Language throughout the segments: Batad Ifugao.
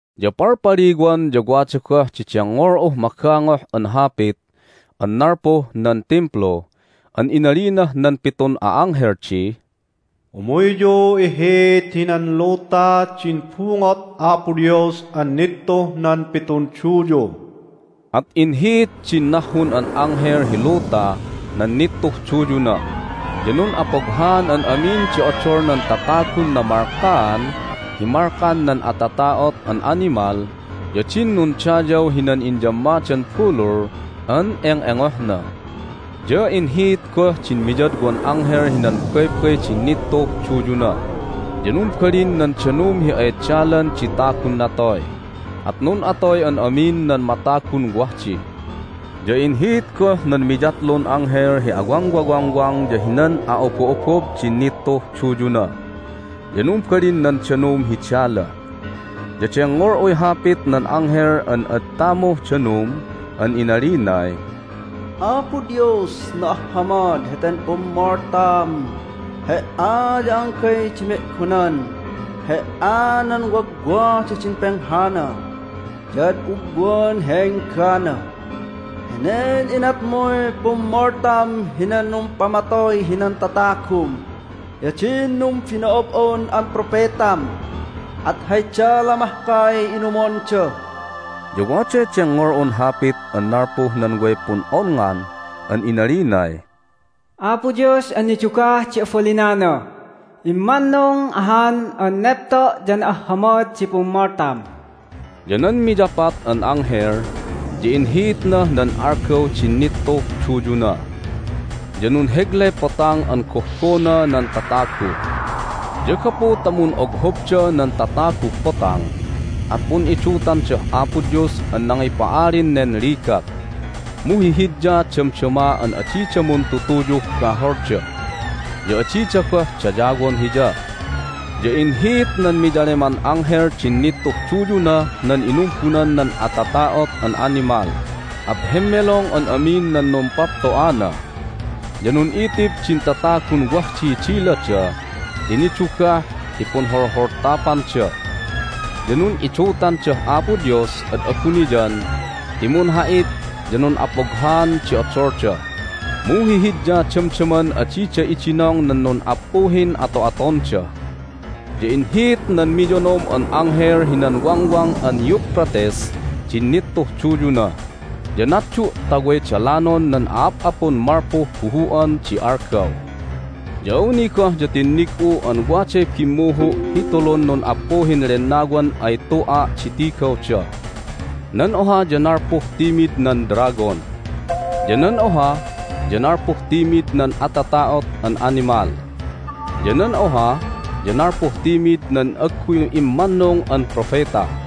Ya palpaliwan ya wada goh di dengngol'uh magangoh an hapit an nalpuh nan Timplu an inalinah nan pitun a'anghel di, "Umuyyu ihiit hinan luta din bungot Apo Dios an nittuh nan pitun duyu!" At inhiit din nahhun an anghel hi luta nan nittuh duyuna, ya nun'apoghaan an amin di odol nan tatagun namalkaan hi malkan nan atata'ot an animal ya din nundayaw hinan inyammadan bulul an eng'engohna. Ya inhiit goh din miyadwan anghel hinan baybay din nittuh duyuna, ya numbalin nan danum hi ay dalan di tagun natoy. At nun'atoy an amin nan matagun wah di. Ya inhiit goh nan miyatlun anghel hi awangwawangwang ya hinan a'obo'obob din nittuh duyuna, ya numbalin nan danum hi dala. Ya dengngol'uy hapit nan anghel an ad tamuh danum an inalinay, "Apo Dios, na'ahhamad heten pummoltam! He"a ya anggay di me'gonan! He"a nan wagwadah din penghana ya ad ugwan hi enggana! Henen inatmuy pummoltam hinan numpamatoy hinan tatagum ya din numbino'ob'on an propetam, at hay dala mahkay inumonda!" Ya waday dengngol'un hapit an nalpuh nan way pun'onngan an inalinay, "Apo Dios an nidugah di abalinana, immannung ahan an nepto' ya na'ahhamad di pummoltam!" Ya nan miyapat an anghel ya inhiitnah nan algaw din nittuh duyuna, ya nunheglay potang an gohbona nan tatagu. Ya gapu ta mun'oghobda nan tataguh potang at pun'idutandah Apo Dios an nangipa'alin nen ligat, mu hihidya damdama an adida muntutuyuh baholda, ya adida goh dayawon Hiya. Ya inhiit nan miyaleman anghel din nittuh duyunah nan inumbunan nan atata'ot an animal, at hemmelong an amin nan numpapto'ana. Ya nun'itib din tatagun wah diy dilada ti nidugah hi punholholtapanda. Ya nun'idutandah Apo Dios ad abuniyan ti munha'it ya nun'apoghaan di odolda, mu hihidya damdaman adida idinong nan nun'appuhin ato'atonda. Ya inhiit nan miyonom an anghel hinan Wangwang an Euphrates din nittuh duyuna, ya natdu' ta way dalanon nan a'ap'apun malpuh buhu'an di algaw. Ya awni goh ya tinnig'u an waday bimmuhu' hi tulun nun'appuhin lennawan ay tu'a' di tigawda. Nan oha ya nalpuh timid nan dragon, ya nan oha ya nalpuh timid nan atata'ot an animal, ya nan oha ya nalpuh timid nan agguy immannung an propeta.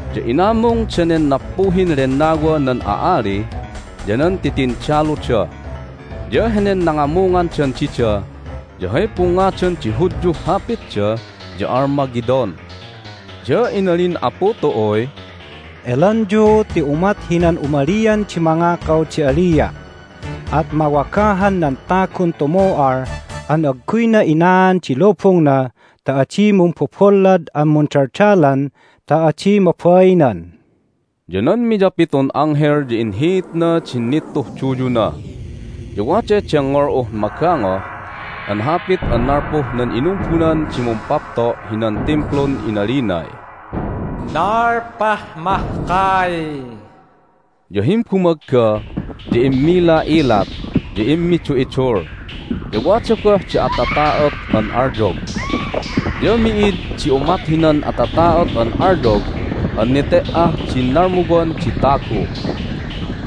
Ya inamung danen nappuhin lennawa nan a'ali ya nan titindaluda. Ya henen nangamungandan dida ya hay pungngadan di Hudyuh hapitda ya Armageddon. Ya inalin Apu tu'uy, "Elanyu ti umat hinan umalian di mangakaw di alia'! At mawagahan nan tagun tumu'al an agguyna inaan di lubungna ta adi mumbobollad an mundaldalan ta adi mabainan!" Ya nan miyapitun anghel ya inhiitna din nittuh duyuna, ya waday dengngol'uh magangoh an hapit an nalpuh nan inumbunan di Mumpapto' hinan Timplun inalinay, "Nalpah mahkay!" Ya himbumagga ya immila'ilat, ya immidu'idul, ya wada goh di atata'ot an alyog. Ya mi'id di umat hinan atata'ot an alyog an nete"ah din nalmuwan di tagu.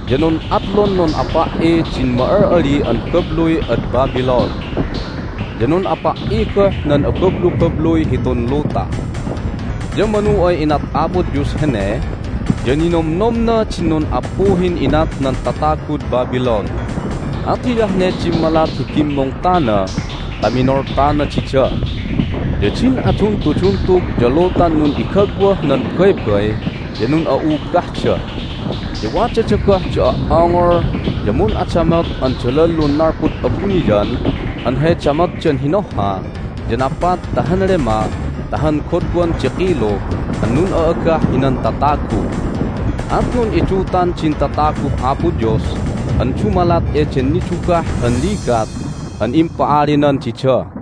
Ya nun'atlun nun'apa"i din ma'al'ali an babluy ad Babylon, ya nun'apa"i goh nan abablubabluy hitun luta. Ya manu ay inat Apo Dios hene ya ninomnomna din nun'appuhin inat nan tatagud Babylon, at hiyah ne dimmalat hi bimmungtana ta minoltana dida. Ya din aduntuduntug ya lutan nun'igagwah nan baybay ya nun'a'ubahda. Ya wadada goh di o"ongol ya mun'adamot an dalallun nalpud abuniyan an hay damotdan hinohha ya napat ta han lema ta han godwan di kilu an nun'a'agah hinan tatagu. At nun'idutan din tataguh Apo Dios an dumalat eden nidugah an ligat an impa'alinan dida.